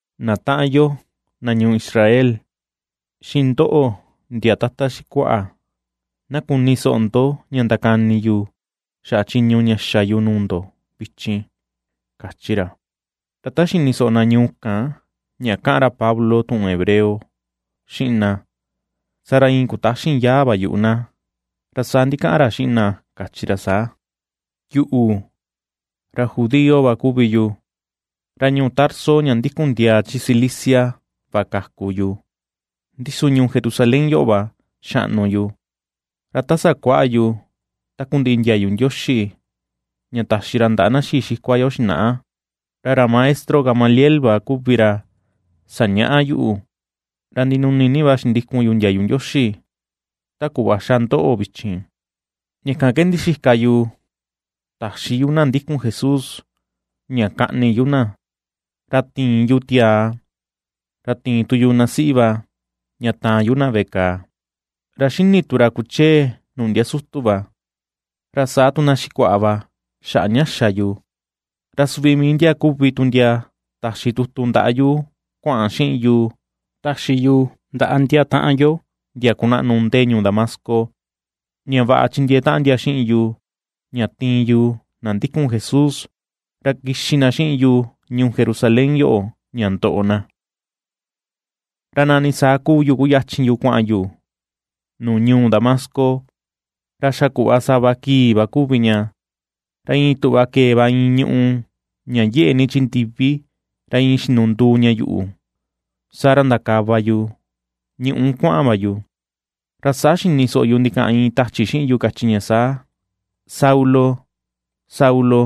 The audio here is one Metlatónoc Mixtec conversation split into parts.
―Na taꞌan yo, na ñuu Israel, xiꞌin ndoꞌo ndia tata xikuaꞌa, na kuni soꞌo ndo ña ndakani yu xaꞌa chiñu ña xa yu nuu ndo vichin ―kachi ra. Ra ta xini soꞌo na ñuu kan ña kaꞌan ra Pablo tuꞌun hebreo xiꞌin na, saa ra iin kutaxin yaa va yuꞌu na. Ra saa ndikaꞌan ra xiꞌin na, kachi ra saa: ―Yuꞌu, ra judío va kuvi yu. Ra ñuu Tarso ña ndikun ndiaa chi Cilicia va kaku yu, ndi su ñuu Jerusalén yoꞌo va xaꞌnu yu. Ra ta sakuaꞌa yu takundiꞌi ndiayu Ndioxi ña taxi ra ndaꞌa na xii xikua yo xinaꞌa, ra ra maestro Gamaliel va kuvi ra sañaꞌa yuꞌu. Ra ndinuni ni va xindikun yu ndiayu Ndioxi, ta kuꞌva xa ndoꞌo vichin. Ña kan ke ndixika yu taxi yu na ndikun Jesús ña kaꞌni yu na, ra tiin yu tiaa, ra tiin tu yu na siꞌi va ña taan yu na veꞌe kàà. Ra ^xini tu ra kuchee nuu ndia sutu va, ra saa tu na xikuaꞌa va xaꞌa ña xa yu, ra suvi mii ndia kuvi tu ndia taxi tutu ndaꞌa yu kuaꞌan xiꞌin yu taxi yu ndaꞌa ndia taꞌan yo ndia kunaꞌnu ndee ñuu Damasco, ña vaꞌa chindiee taꞌan ndia xiꞌin yu, ña tiin yu na ndikun Jesús, ra kixi na xiꞌin yu ñuu Jerusalén yoꞌo ña ndoꞌo na. ’Ra nani saa kuu yu kuyachin yu kuaꞌan yu nuu ñuu Damasco, ra xa kuꞌva sava kii va kuvi ña, ra iin tuꞌva kee va iin ñuꞌu ña yeꞌe ni chi ndivi, ra iin xinunduu ña yuꞌu. Saa ra ndakava yu ñuꞌu kuaꞌan va yu. Ra saa xini soꞌo yu ndikaꞌan iin tachi xiꞌin yu kachi ña saa: “Saulo, Saulo,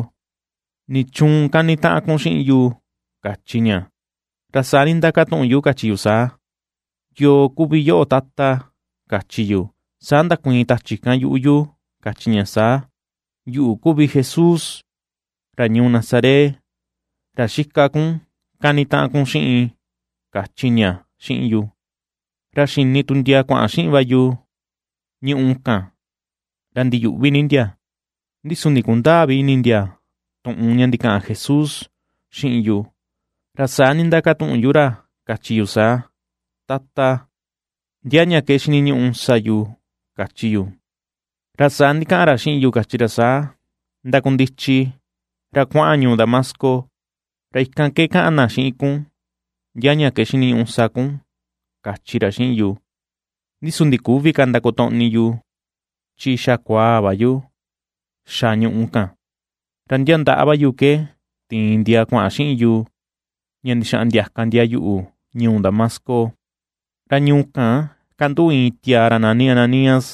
¿nichuun kanitaꞌan kun xiꞌin yu?”, kachi ña. Ra saa nindakatuꞌun yu, kachi yu saa: “¿Yoo kuvi yoꞌo, Tata?”, kachi yu. Saa ndakuiin tachi kan yuꞌu yu kachi ña saa: “Yuꞌu, kuvi Jesús ra ñuu Nazaret, ra xika kun kanitaꞌan kun xiꞌin”, kachi ña xiꞌin yu. Ra xini tu ndia kuaꞌan xiꞌin va yu ñuꞌu kan ra ndiyuꞌvi ni ndia, ndi su ndikundäa vi ini ndia tuꞌun ña ndikaꞌan Jesús xiꞌin yu. Ra saa nindakatuꞌun yu ra kachi yu saa: “Tata, ¿ndia ña ke xiniñuꞌu sa yu?”, kachi yu. Ra saa ndikaꞌan ra xiꞌin yu kachi ra saa: “Ndakundichi, ra kuaꞌan ñuu Damasco. Ra ikan ke kaꞌan na xiꞌin kun ndia ña ke xiniñuꞌu sa kun”, kachi ra xiꞌin yu. Ndi su ndiküvi ka kotoꞌni yu chi xa kukuaa va yu xa ñuꞌu kan, ra ndia ndaꞌa va yu ke tiin ndia kuaꞌan xiꞌin yu, ña ndixaꞌan ndiaka ndia yuꞌu ñuu Damasco. ’Ra ñuu kan kanduꞌu iin tiaa ra nani Ananías,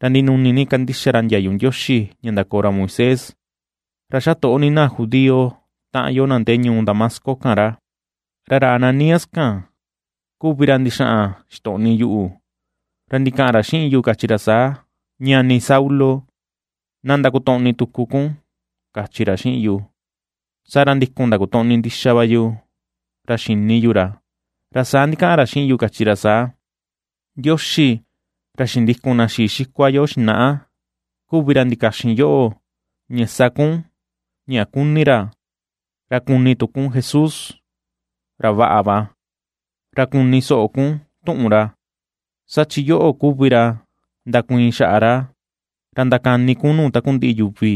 ra ndinuni ni kandixa ra ndiayu Ndioxi ña ndakoo ra Moisés. Ra xa toꞌo ni na judío taꞌan yo na ndee ñuu Damasco kan ra. Ra ra Ananías kan kuvi ra ndixaꞌan ixtoꞌni yuꞌu, ra ndikaꞌan ra xiꞌin yu, kachi ra saa: “Ñani Saulo, na ndakotoꞌni tuku kun”, kachi ra xiꞌin yu. Saa ra ndikun ndakotoꞌni ndixa va yu, ra xini yu ra. Ra saa ndikaꞌan ra xiꞌin yu kachi ra saa: “Ndioxi ra xindikun na xii xikua yo xinaꞌa kuvi ra ndikaxin yoꞌo ña sa kun ña kuni ra, ña kuni tu kun Jesús, ra vaꞌa, ra kuni soꞌo kun tuꞌun ra. Saa chi yoꞌo kuvi ra ndakuiin xaꞌa ra, ra ndakani kun nuu takundiꞌi yuvi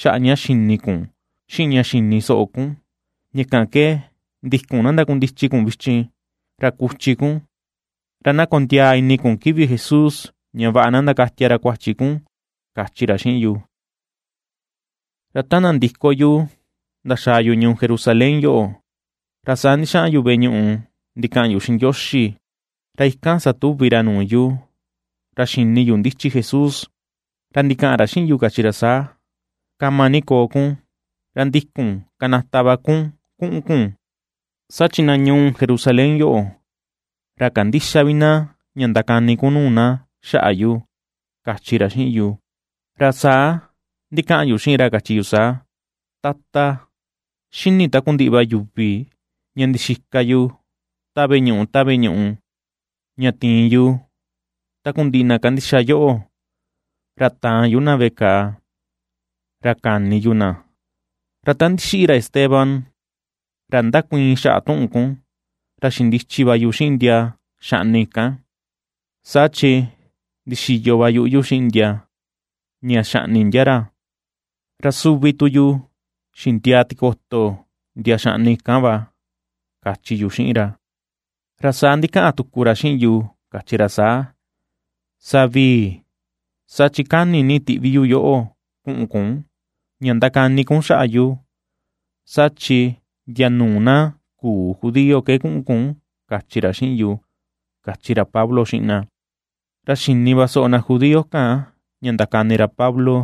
xaꞌa ña xini kun xiꞌin ña xini soꞌo kun. Ña kan ke ndikun na ndakundichi kun vichin, ra kuchi kun, ra na kondiaa ini kun kivi Jesús ña vaꞌa na ndakatia ra kuachi kun”, kachi ra xiꞌin yu. ’Ra ta nandiko yu ndaxaa yu ñuu Jerusalén yoꞌo, ra saa ndixaꞌan yu veꞌe ñuꞌu ndikaꞌan yu xiꞌin Ndioxi. Ra ikan satuvi ra nuu yu. Ra xini yu ndichi Jesús ra ndikaꞌan ra xiꞌin yu, kachi ra saa: “Kama ni koo kun, ra ndikun kanata va kun kuꞌun kun, saa chi na ñuu Jerusalén yoꞌo, ra kandïxa vi na ña ndakani kun nuu na xaꞌa yu”, kachi ra xiꞌin yu. Ra saa ndikaꞌan yu xiꞌin ra, kachi yu saa: “Tata, xini takundiꞌi va yuvi ña ndixika yu ta veꞌe ñuꞌu ta veꞌe ñuꞌu, ña tiin yu takundiꞌi na kandixa yoꞌo, ra taan yu na veꞌe kàà, ra kani yu na. Ra ta ndixiꞌi ra Esteban, ra ndakuiin xaꞌa tuꞌun kun, ra xindichi va yu xiꞌin ndia xaꞌni kan, saa chi ndixiyo va yuꞌu yu xiꞌin ndia ña xaꞌni ndia ra, ra suvi tu yu xindiaa tikoto ndia xaꞌni kan va”, kachi yu xiꞌin ra. Ra saa ndikaꞌan tuku ra xiꞌin yu, kachi ra saa: “Savii, saa chi kani ni tiꞌvi yu yoꞌo kuꞌun kun ña ndakani kun xaꞌa yu, saa chi ndia nuu na küu judío ke kuꞌun kun”, kachi ra xiꞌin yu, ―kachi ra Pablo xiꞌin na. Ra xini va soꞌo na judío kan ña ndakani ra Pablo,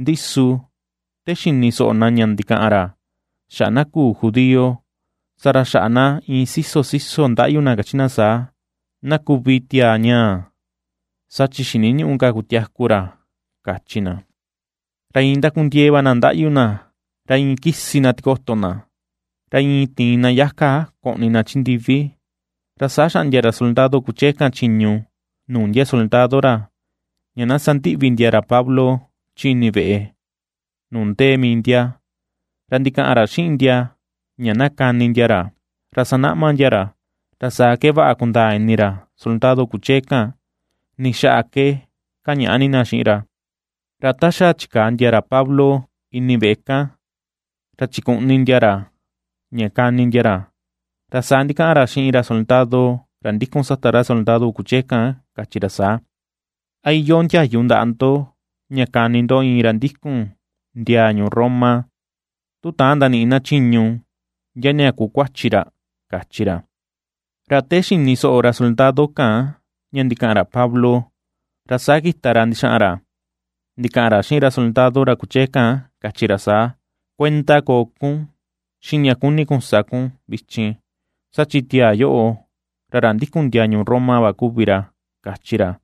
ndi su te xini soꞌo na ña ndikaꞌan ra xaꞌa na küu judío, saa ra xaꞌa na iin siso siso ndaꞌyu na kachi na saa: ―¡Na kuvi tiaa ñaa! ¡Saa chi xiniñüꞌu ka kutiaku ra! ―kachi na. Ra iin ndakundiee va na ndaꞌyu na, ra iin kisi na tikoto na, ra iin tiin na yaka koꞌni na chi ndivi, Ra saa xaꞌndia ra soldado kuchee kan chiñu nuu ndia soldado ra, ña na sandiꞌvi ndia ra Pablo chi ini veꞌe nuu ndee mii ndia, ra ndikaꞌan ra xiꞌin ndia ña na kani ndia ra, ra sanaꞌma ndia ra, ra saa ke vaꞌa kundaa ini ra soldado kuchee kan, ni xaꞌa ke kañaꞌa ni na xiꞌin ra. Ra ta xa chikaa ndia ra Pablo ini veꞌe kan ra chikuꞌni ndia ra, ña kani ndia ra, ra saa ndikaꞌan ra xiꞌin ra soldado ra ndikun sata ra soldado kuchee kan kachi ra saa: ―¿A iyoo ndiayu ndaꞌa ndo ña kani ndo iin ra ndikun ndiaa ñuu Roma, tu täan ndaniꞌi na chiñu ndia ña kuu kuachi ra? ―kachi ra. Ra te xini soꞌo ra soldado kan ña ndikaꞌan ra Pablo, ra saa kita ra ndixaꞌan ra ndikaꞌan ra xiꞌin ra soldado ra kuchee kan, kachi ra saa: ―Kuenda koo kun xiꞌin ña kuni kun sa kun vichin, saa chi tiaa yoꞌo ra ra ndikun ndiaa ñuu Roma va kuvi ra ―kachi ra.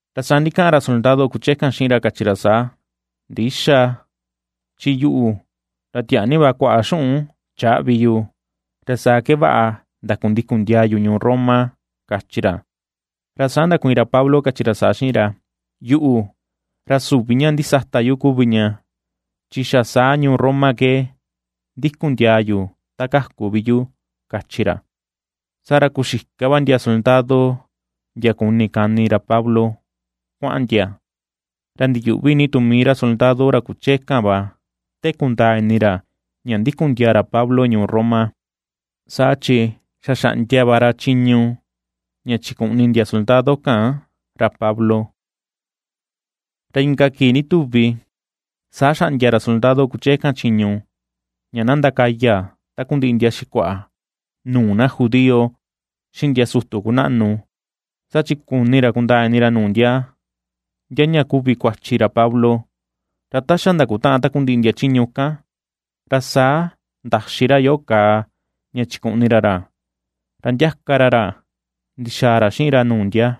Ra saa ndikaꞌan ra soldado kuchee kan xiꞌin ra, kachi ra saa: ―Ndïxa, chin yuꞌu, ra tiaa ni va kuaꞌa xuꞌun chaꞌvi yu, ra saa ke vaꞌa ndakundikun ndiaa yu ñuu Roma ―kachi ra. Ra saa ndakuiin ra Pablo kachi ra saa xiꞌin ra: ―Yuꞌu, ra süvi ña ndisata yu kuvi ña, chi xa saa ñuu Roma ke ndikun ndiaa yu ta kaku vi yu ―kachi ra. Saa ra kuxika va ndia soldado ndia kuni kani ra Pablo, kuaꞌan ndia, ra ndiyuꞌvi ni tu mii ra soldado ra kuchee kan va te kundaa ini ra ña ndikun ndiaa ra Pablo ñuu Roma, saa chi xa xaꞌndia va ra chiñu ña chikuꞌni ndia soldado kan ra Pablo. Ra inka kii ndituvi saa xaꞌndia ra soldado kuchee kan chiñu ña na ndakaya takundiꞌi ndia xikuaꞌa nuu na judío, xiꞌin ndia sutu kunaꞌnu, saa chi kuni ra kundaa ini ra nuu ndia, ndia ña kuvi kuachi ra Pablo. Ra ta xa ndakutaꞌan takundiꞌi ndia chiñu kan, ra saa ndaxi ra yoꞌo kàà ña chikuꞌni ra ra, ra ndiaka ra ra ndixaa ra xiꞌin ra nuu ndia.